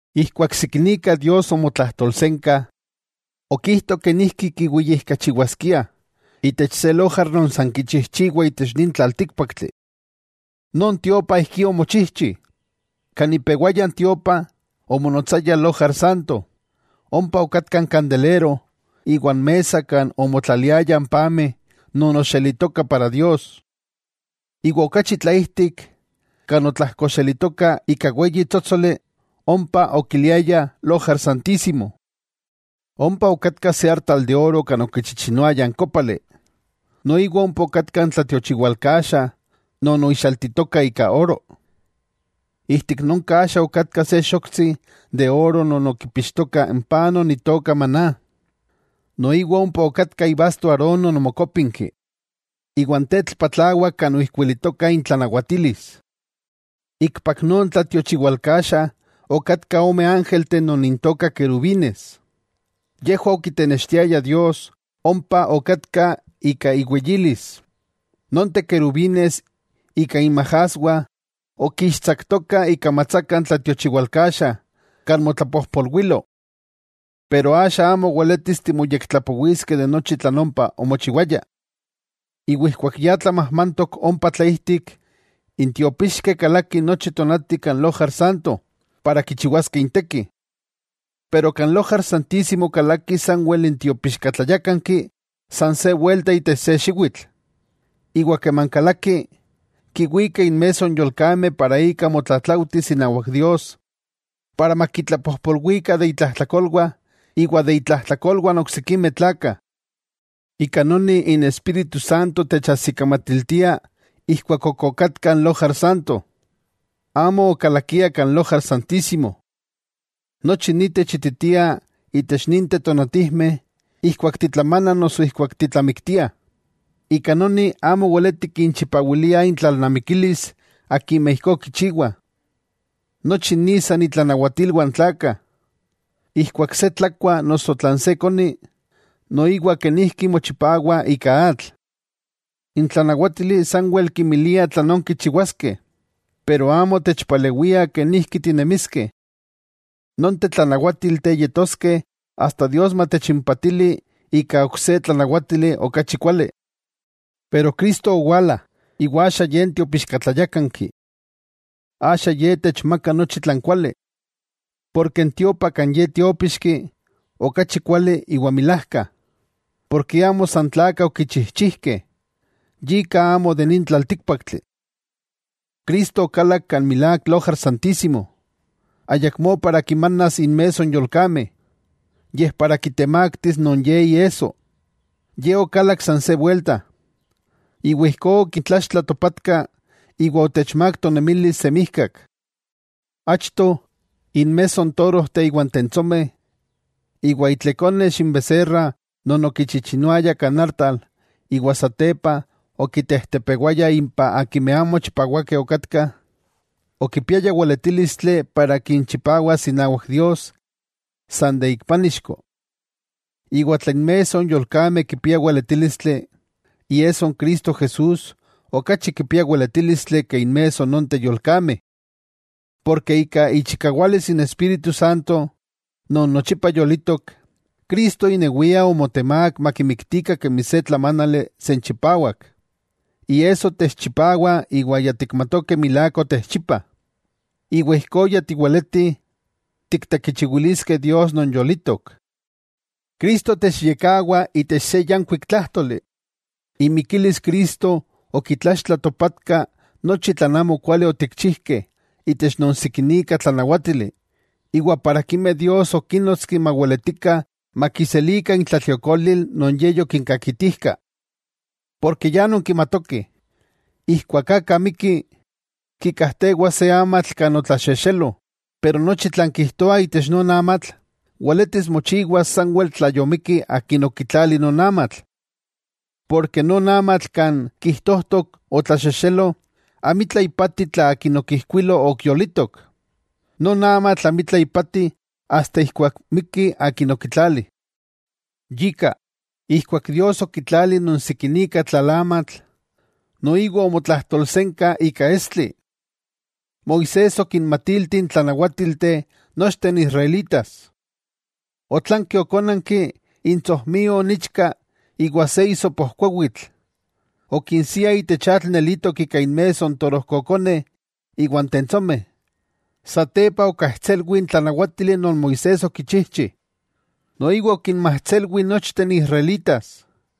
Ijkuak sikinika Dios omotlajtolsenka, okijto kenijki kiweyijkachiwaskiah itech se lojar non san kichijchiwah itech nin tlaltíkpaktli. Non tiopa ijki omochijchi: kan ipewaya n tiopa, omonotsaya lojar Santo, ompa okatka n kandelero iwa n mesa kan omotlaliayah n pameh non oxelitokah para Dios. Iwa okachi tlaijtik, kan otlajkoxelitoka ika weyi tsótsoli, ompa okiliayah Lojar Santísimo. Ompa okatka se artal de oro kan okichichinoayah n kópali. Noiwa ompa okatka n tlatiochiwalkaxa non oixaltitoka ika oro. Ijtik non kaxa okatka se xoktsi de oro non okipixtoka n paj non itoka maná, noiwa ompa okatka ibasto Aarón non omokópinki iwan tetl patlawak kan oijkuilitokah intlanawatilis. Ikpak non tlatiochiwalkaxa okatkah ome ángelteh non intokah querubines, yejwah okitenextiayah Dios ompa okatka ika iweyilis. Nonteh querubines ika inmajaswah okixtsaktokah ikamatsaka n tlatiochiwalkaxa kan motlapojpolwilo. Axa amo weletis timoyektlapowiskeh tlan ompa omochiwaya. Keman ya tlamajmantok ompa tlaijtik, n tiopixkeh kalakih nochi tonati kan Lojar Santo para kichiwaskeh inteki. Pero kan Lojar Santísimo kalaki sanwel n tiopixkatlayákanki san se welta itech se xiwitl. Iwa keman kalaki, kiwika inmesso n yolkameh non ika motlatlaujtis inawak Dios iwa makitlapojpolwikah de itlajtlakolwah iwa de itlajtlakolwah n oksikimeh tlakah. Ika noni n Espíritu Santo techajsikamatiltia ijkuak okatka n Lojar Santo, amo okalakia kan Lojar Santísimo. Nochi ni techititia itech ninteh tonatijmeh, ijkuak titlamanah noso ijkuak titlamiktiah, ika noni amo weleti kinchipawiliah intlalnamikilis akimeh ijkó kichiwah. Nochi ni san itlanawatilwah n tlakah, ijkuak se tlakua, noso tlan se koni, noiwa kenijki mochipawah ika atl. N tlanawátili sanwel kinmilia tlanón kichiwaskeh, pero amo techpalewia kenijki tinemiskeh. Nonteh tlanawátilteh yetoskeh asta Dios matechimpatili ika ok se tlanawatili okachi kuali. Cristo yowala, iwa axa Ye n Tiopixkatlayákanki. Axa Ye techmakah nochi tlan kuali. Porke n tiopa kan Ye tiópixki, okachi kuali iwa milajka. Porke amo san tlakah okichijchijkeh, yika amo de nin tlaltíkpaktli. Cristo okalak kan milák Lojar Santísimo, ayakmó para kimanas inmesso n yolkameh, yej para kitemaktis non Ye iesso. Ye okalak san se wuelta, iwa ijkó okitlaxtla topatka iwa otechmák tonemilis semijkak. Achto, inmesso n torojteh iwa n tentsomeh, iwa itlekonex n beserra non okichichinoayah kan artal iwa satepa okitejtepewayah impah akimeh amo chipawakeh okatkah, okipiaya weletílistli para kinchipawas inawak Dios san ik pánixko. Iwa tla inmesso n yolkameh kipia weletílistli, ¡Iesso n Cristo Jesús okachi kipia weletílistli ke inmesso nonteh yolkameh! Porke ika ichikawalis n Espíritu Santo non nochipa yolitok, Cristo inewia omotemák makimiktikah kemi se tlamánali senchipawak. Iesso techchipawa iwa ya tikmatokeh milák otechchipa. Iwa ijkó ya tiweleti tiktekichiwiliskeh Dios non yolitok. Cristo techyekkawa itech se yankuik tlájtoli, imikilis Cristo okitlaxtla topatka nochi tlan amokuali otikchijkeh itech non sikinika tlanawátili, iwa akimeh Dios okinnotski maweletikah makiselikah intlatliokolil non Ye yokinkakitijka. Porke ya nonkimatokeh, ijkuak aka mikki, kikajtewa se amatl kan otlaxexelo, nochi tlan kijtoa itech non amatl, weletis mochiwas sanwel tla yomikki akin okitlali non amatl. Porke non amatl kan kijtojtok otlaxexelo amitla ipati tla akin okijkuilo ok yolitok, non amatl amitla ipati asta ijkuak miki akin okitlali. Yika, ijkuak Dios okitlali non sikinika tlalamatl, noiwa omotlajtolsenka ika estli. Moisés okinmatilti n tlanawátilteh nochteh n israelitas. Otlanki okónanki intsojmio n ichka iwa se isopojkuawitl, okinsia itech atl nelitok ika inmesso n torojkokoneh iwa n tentsomeh, satepa okajtselwi n tlanawátili non Moisés okinchijchi, noiwa okinmajtselwi nochteh n israelitas.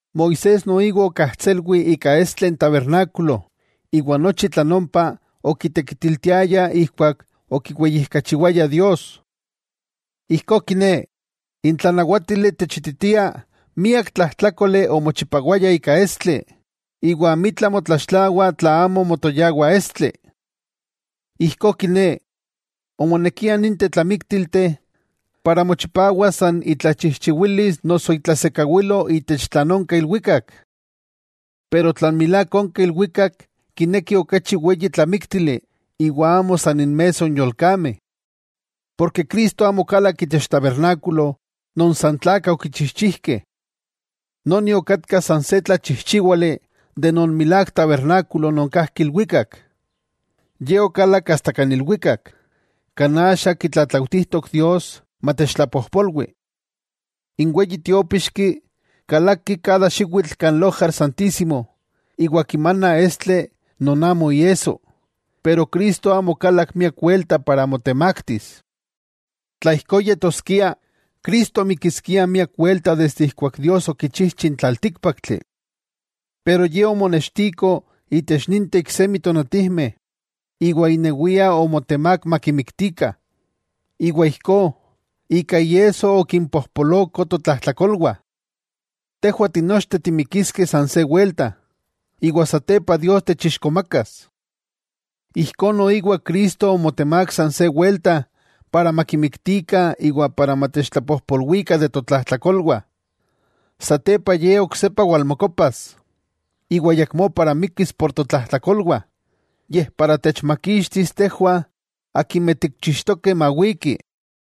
Moisés noiwa okajtselwi ika estli n tabernákulo iwa nochi tlan ompa okitekitiltiayah ijkuak okiweyijkachiwayah Dios. Ijkó kiné, n tlanawátili techititia miak tlajtlákoli omochipawaya ika estli, iwa amitla motlaxtlawah tla amo motoyawa estli. Ijkó kiné, omonekia ninteh tlamíktilteh para mochipawas san itlachijchiwilis noso itlasekawilo itech tlan onka ilwikak. Pero tlan milák onka ilwikak kinekih okachi weyi tlamíktili iwa amo san inmesso n yolkameh. Porke Cristo amo okalak itech tabernákulo non san tlakah okichijchijkeh. Noni okatka san se tlachijchiwali kemi n milák tabernákulo non kajki ilwikak. Ye okalak kan ilwikak, kan axa kitlatlautijtok Dios matechtlapojpolwi. N weyi tiopíxki, kalaki nochi xiwitl kan Lojar Santísimo iwa kimana estli non amo iesso, pero Cristo amo okalak miak welta para motemaktis. Tla ijkó yetoskia, Cristo mikiskia miak welta desde ijkuak Dios okichijchi n tlaltíkpaktli. Pero Ye omonextiko itech ninteh iksemi tonatijmeh iwa inewia omotemák makimiktikah, iwa ijkó, ika iesso okimpojpoloko totlajtlakolwah. Tejwah tinochteh timikiskeh san se welta, iwa satepa Dios techixkomakas. Ijkó noiwa Cristo omotemák san se welta para makimiktikah iwa ijkó matechtlapojpolwikah de totlajtlakolwah. Satepa Ye oksepa walmokopas, iwa ayakmó mikkis por totlajtlakolwah, yej para techmakixtis tejwah akimeh tikchixtokeh mawiki.